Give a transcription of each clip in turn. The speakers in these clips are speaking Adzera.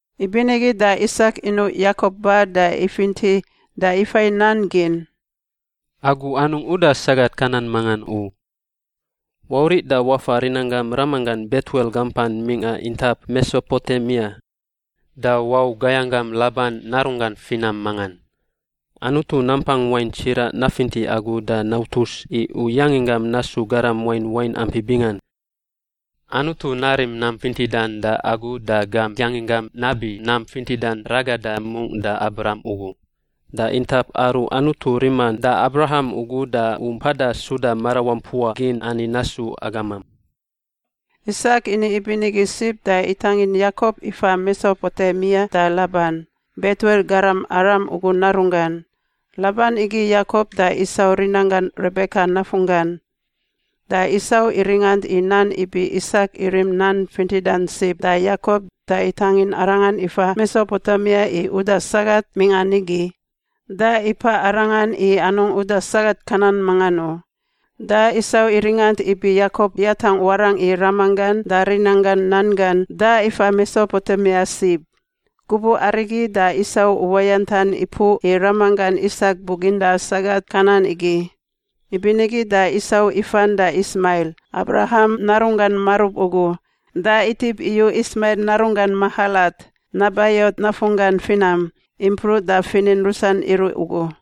Ibinigi da Isak inuꞌ Yakop ba da ifinti da ifai nan gin, “Agu anungꞌ uda sagat Kanan mangan u. Wauriꞌ da wafa rinanggam ramanggan Betuel gampan mingꞌa intap Mesopotemia, da wau gayanggam Laban narunggan finam mangan. Anutu Nampang Wain Tsiraꞌ nafinti agu da nautus i u yanginggam nasu garam wain wain ampi bingan. Anutu narim nam fintidan da agu da gam yanginggam nabi nam fintidan ragada mungꞌ da Abraham ugu. Da intap aru Anutu riman da Abraham ugu da u mpada suda marawampua gin ani nasu agamam.” Isak ini ibinigi sib da itangin Yakop ifa Mesopotemia da Laban, Betuel garam Aram ugu narunggan. Laban igi Yakop da Isau rinanggan Rebeka nafunggan. Da Isau iringant i nan ibi Isak irim nan fintidan sib da Yakop da itangin arangan ifa Mesopotemia i uda sagat mingꞌa nigi, da ipaꞌ arangan i anungꞌ uda sagat Kanan mangan u. Da Isau iringant ibi Yakop yatangꞌ warangꞌ i ramanggan da rinanggan nan gan da ifa Mesopotemia sib. Gubuꞌ arigi da Isau uwayantan ipuꞌ i ramanggan Isak buginda sagat Kanan igi. Ibinigi da Isau ifan da Ismail, Abraham narunggan marub ugu, da itip iyu Ismail narunggan Mahalat, Nebaiot nafunggan finam, impruꞌ da finin rusan iruꞌ ugu.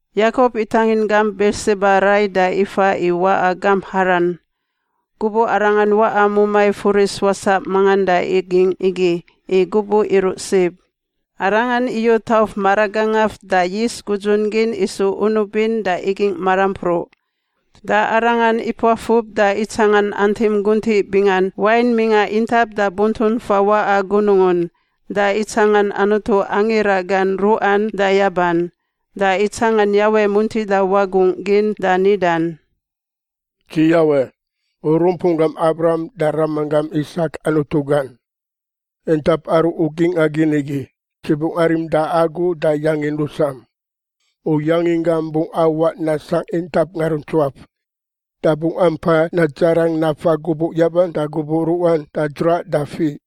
Yakop itangin gamp Birsiba rai da ifa i waꞌa gamp Haran. Gubuꞌ arangan waꞌa mumai furis wasaꞌ mangan da igingꞌ igi, i gubuꞌ iruꞌ sib. Arangan iyu tauf maragangaf da yis gudzun gin isu unubin da igingꞌ marampruꞌ. Da arangan ipuafub da itsangan antim guntiꞌ bingan wain mingꞌa intap da buntun fawaꞌa gunungun, da itsangan Anutu angira gan ruꞌan da yaban. Da itsangan Yawe muntida wagungꞌ gin da nidan, “Dzi Yawe, u rumpunggam Abraham da ramanggam Isak Anutu gan. Intap aru u gingꞌa gin igi, Dzi bungꞌ arim da agu da yangin rusam. U yanginggam bungꞌ awaꞌ nasangꞌ intap ngaruntsuaf, da bungꞌ ampa nadzarang nafa gubuꞌ yaban da gubuꞌ ruꞌan da dzraꞌ da fiꞌ.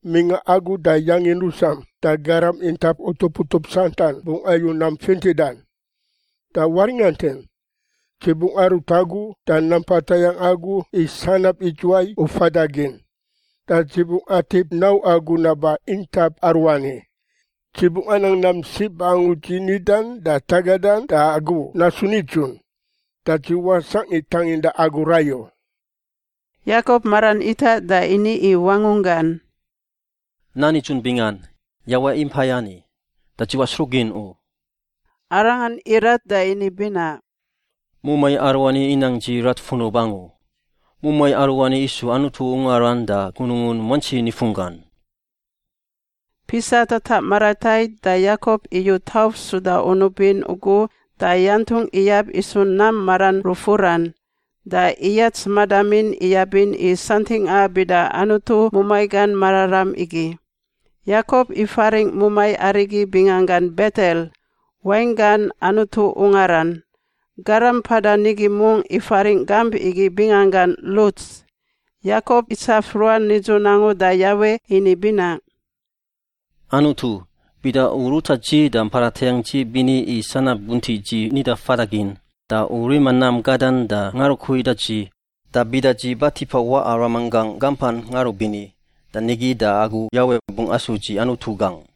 Mingꞌa agu da yangin rusam da garam intap utup utup santan bungꞌ ayu nam fintidan. Da waringantin, dzi bungꞌ arut agu da nampa tayangꞌ agu i sanab idzuwai u fada gin, da dzi bungꞌ atip nau agu naba intap aruani. Dzi bungꞌ anang nam sib angu dzi nidan da tagadan da agu nasu nidzun, da dzi wasangꞌ i tanginda agu rai u.” Yakop maran itaꞌ da ini i wangunggan, “Nan nidzun bingan, Yawe impai ani, da dzi wasruꞌ gin u.” Arangan irat da ini binaꞌ, “Mumai aruani inang dzi rat funub angu. Mumai aruani isu Anutu ungaran da gunungun muantsi nifunggan.” Pisa tataꞌ maratait da Yakop iyu tauf suda unub in ugu da yantungꞌ iyab isu nam maran rufuran. Da iyats madamin iyabin i santingꞌa bida Anutu mumai gan mararam igi. Yakop ifaringꞌ mumai arigi binganggan Betel— wainggan Anutu ungaran. Garam mpada nigi mungꞌ ifaringꞌ gamp igi binganggan Luts. Yakop itsaf ruan nidzun angu da Yawe ini binaꞌ, “Anutu, bida u ruta dzi da mpada tayangꞌ dzi bini i sanab guntiꞌ dzi nida fada gin da u rima nam gadan da ngarukui da dzi, da bida dzi ba tipa waꞌa ramanggangꞌ gampan ngarubini da nigi da agu Yawe bungꞌ asu dzi Anutu gangꞌ.